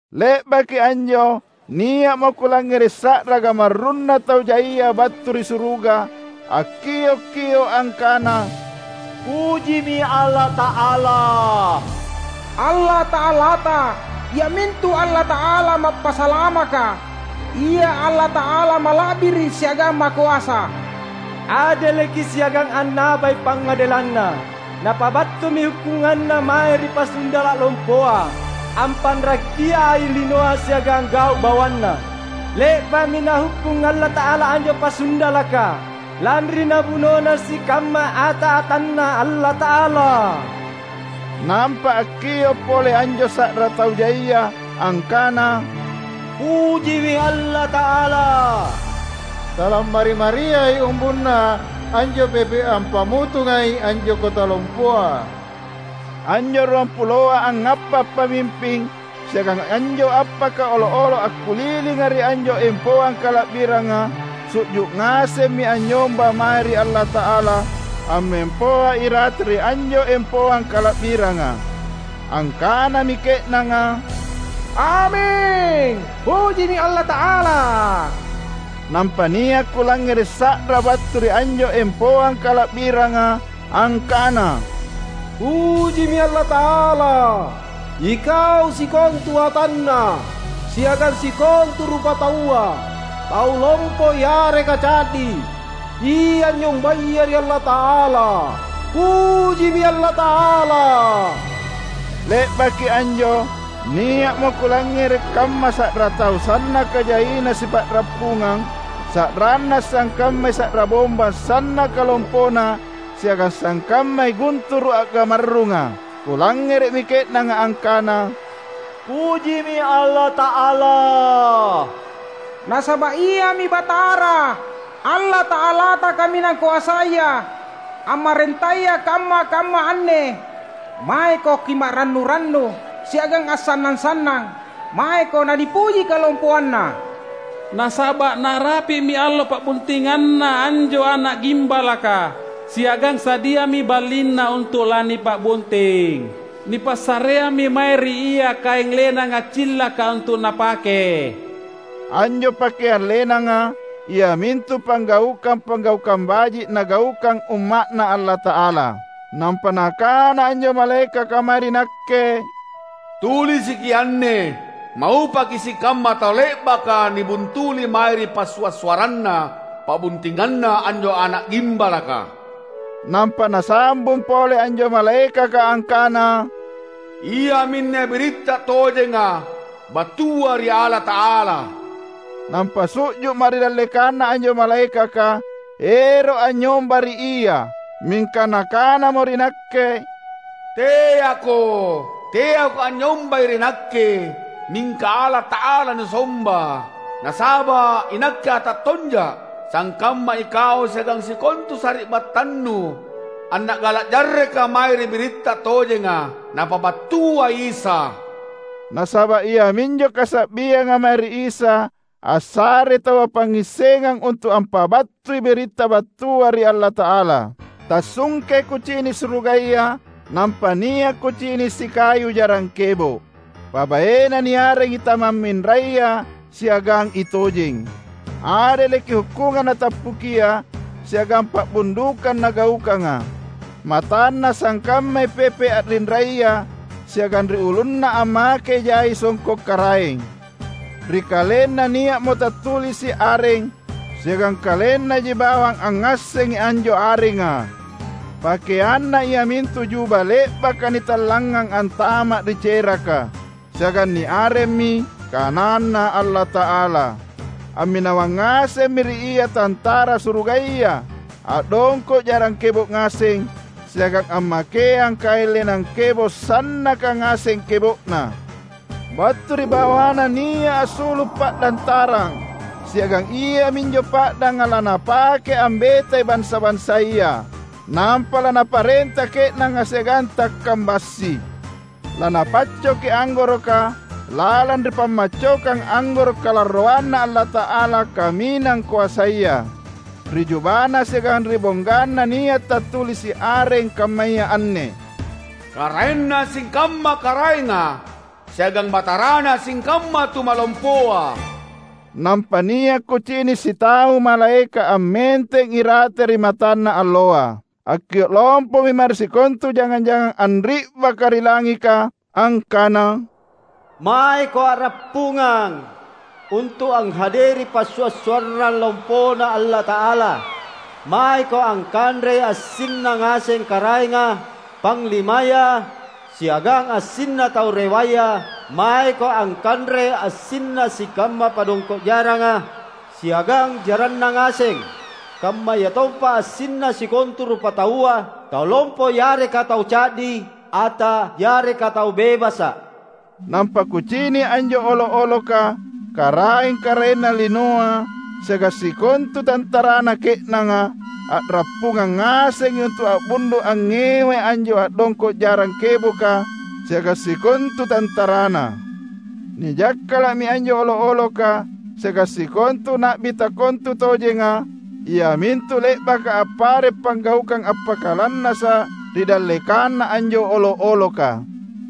Le’baki anjo nia’mo kulangngere’ sa’ra gamarrunna tau jaia battu ri suruga, akkiok-kio’ angkana, "Pujimi Allata’ala! Allata’alata, iamintu Allata’ala Mappasalamaka; Ia Allata’ala Mala’biri’ siagang Makoasa! Adeleki siagang annabai pangngadelanNa! Napabattumi hukkunganNa mae ri pasundala’ lompoa, ampanrakiai linoa siagang gau’ bawanna. Le’ba’mi Nahukkung Allata’ala anjo pasundalaka, lanri nabunona sikamma ata-atanNa Allata’ala." Nampa akkio’ pole anjo sa’ra tau jaia, angkana, "Pujimi Allata’ala! Talammari-mariai umbunna anjo pepe’ ampamutungai anjo kota lompoa!" Anjo ruampuloa angngappa’ pamimping, siagang anjo appaka olo’-olo’ akkulilinga ri anjo empoang kala’biranga, su’ju’ ngasemmi anynyomba mae ri Allata’ala ammempoa irate ri anjo empoang kala’biranga. Angkanami ke’nanga, "Aming! Pujimi Allata’ala!" Nampa nia’ kulangngere’ sa’ra battu ri anjo empoang kala’biranga angkana, "Pujimi Allata’ala, ikau sikontu atanNa, siagang sikontu rupataua, tau lompo yareka ca’di, ia anynyombaya ri Allata’ala, pujimi Allata’ala!" Le’baki anjo nia’mo kulangngere’ kamma sa’ra tau sannaka jaina sipa’rappungang; sa’ranna sangkammai sa’ra bombang sannaka lompona siagang sangkammai gunturu’ a’gamarrunga. Kulangngere’mi ke’nanga angkana, "Pujimi Allata’ala! Nasaba’ Iami Batara, Allata’alata Kaminang Koasaya, ammarentaya kamma-kamma anne! Maeko kima’rannu-rannu siagang assannang-sannang; maeko nanipuji kalompoanNa! Nasaba’ narapi’mi allo pa’buntinganNa anjo Ana’ Gimbalaka, siagang sadiami balinNa untu’ lanipa’bunting. Nipassareammi mae ri Ia kaeng lenang accillaka untu’ Napake." (Anjo pakeang lenanga iamintu panggaukang-panggaukang baji’ nagaukang Umma’Na Allata’ala.) Nampa nakana anjo malaekaka mae ri nakke, "Tulisiki anne: ‘Maupaki sikamma tau le’baka nibuntuli mae ri passua’-suarranna pa’buntinganNa anjo Ana’ Gimbalaka.’" Nampa nasambung pole anjo malaekaka angkana, "Iaminne biritta tojenga, battua ri Allata’ala." Nampa su’ju’ma’ ri dallekanna anjo malaekaka, ero’ anynyomba ri ia; mingka nakanamo ri nakke, "Teako! Teako anynyombai ri nakke, mingka Allata’ala nusomba! Nasaba’ inakke ata tonja’ sangkamma ikau siagang sikontu sari’battannu anna’gala’ jarreka mae ri biritta tojenga, Napabattua Isa!" Nasaba’ iaminjo kasa’bianga mae ri Isa assarei taua pangngissengang untu’ ampabattui biritta battua ri Allata’ala. Tassungkei kucini’ surugaya, nampa nia’ kucini’ sikayu jarang kebo’. PabaeNa niarengi I Tamamminraya siagang I Tojeng. Adeleki hukkungang Natappukia siagang pa’bundukang Nagaukanga. MatanNa sangkammai pepe’ a’rinraya siagang ri ulunNa ammakei jai songko’ karaeng. Ri KalenNa nia’mo tattulisi’ areng; siagang KalenNaji bawang angngassengi anjo arenga. PakeanNa iamintu juba le’baka nitallangngang antama’ ri ceraka. Siagang niaremmi "KananNa Allata’ala". Amminawang ngasemmi ri Ia tantara surugaya, a’dongko’ jarang kebo’ ngaseng, siagang ammakeang kaeng lenang kebo’ sannaka ngaseng kebo’na. Battu ri bawaNa nia’ assulu’ pa’dang tarang; siagang iaminjo pa’danga laNapake ambetai bansa-bansaya, nampa laNaparenta ke’nanga siagang takkang bassi. LaNapaccoki anggoroka lalang ri pammaccokang anggoro’ kalarroanNa Allata’ala Kaminang Koasaya. Ri jubaNa siagang ri bongganNa nia’ tattulisi’ areng kammaya anne, "Karaenna sikamma karaenga, siagang Batarana sikamma tumalompoa." Nampa nia’ kucini’ sitau malaeka’ ammenteng irate ri matanna alloa. Akkio’ lompomi mae ri sikontu jangang-jangang anri’baka ri langika, angkana, "Maeko a’rappungang untu’ anghaderi passua’-suarrang lompoNa Allata’ala! Maeko angkanrei assinna ngaseng karaenga, panglimaya, siagang assinna tau rewaya; maeko angkanrei assinna sikamma padongko’ jaranga siagang jaranna ngaseng, kammayatompa assinna sikontu rupataua, tau lompo yareka tau ca’di, ata yareka tau bebasa’!" Nampa kucini’ anjo olo’-oloka, karaeng-karaenna linoa siagang sikontu tantarana ke’nanga, a’rappungang ngasengi untu’ a’bundu’ angngewai anjo a’dongko’ jarang keboka siagang sikontu tantaraNa. Nijakkala’mi anjo olo’-oloka siagang sikontu na’bi takontutojenga, iamintu le’baka appare’ panggaukang appakalannasa’ ri dallekanna anjo olo’-oloka.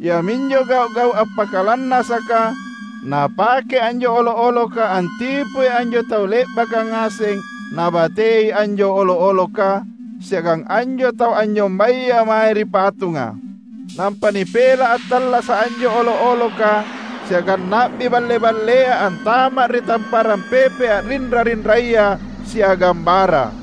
(Iaminjo gau’-gau’ appakalannasaka napake anjo olo’-oloka antipui anjo tau le’baka ngaseng nabatei anjo olo’-oloka, siagang anjo tau anynyombaya mae ri patunga.) Nampa nipela’ attallasa’ anjo olo’-oloka siagang na’bi balle-ballea antama’ ri tamparang pepe’ a’rinra-rinraya siagang bara.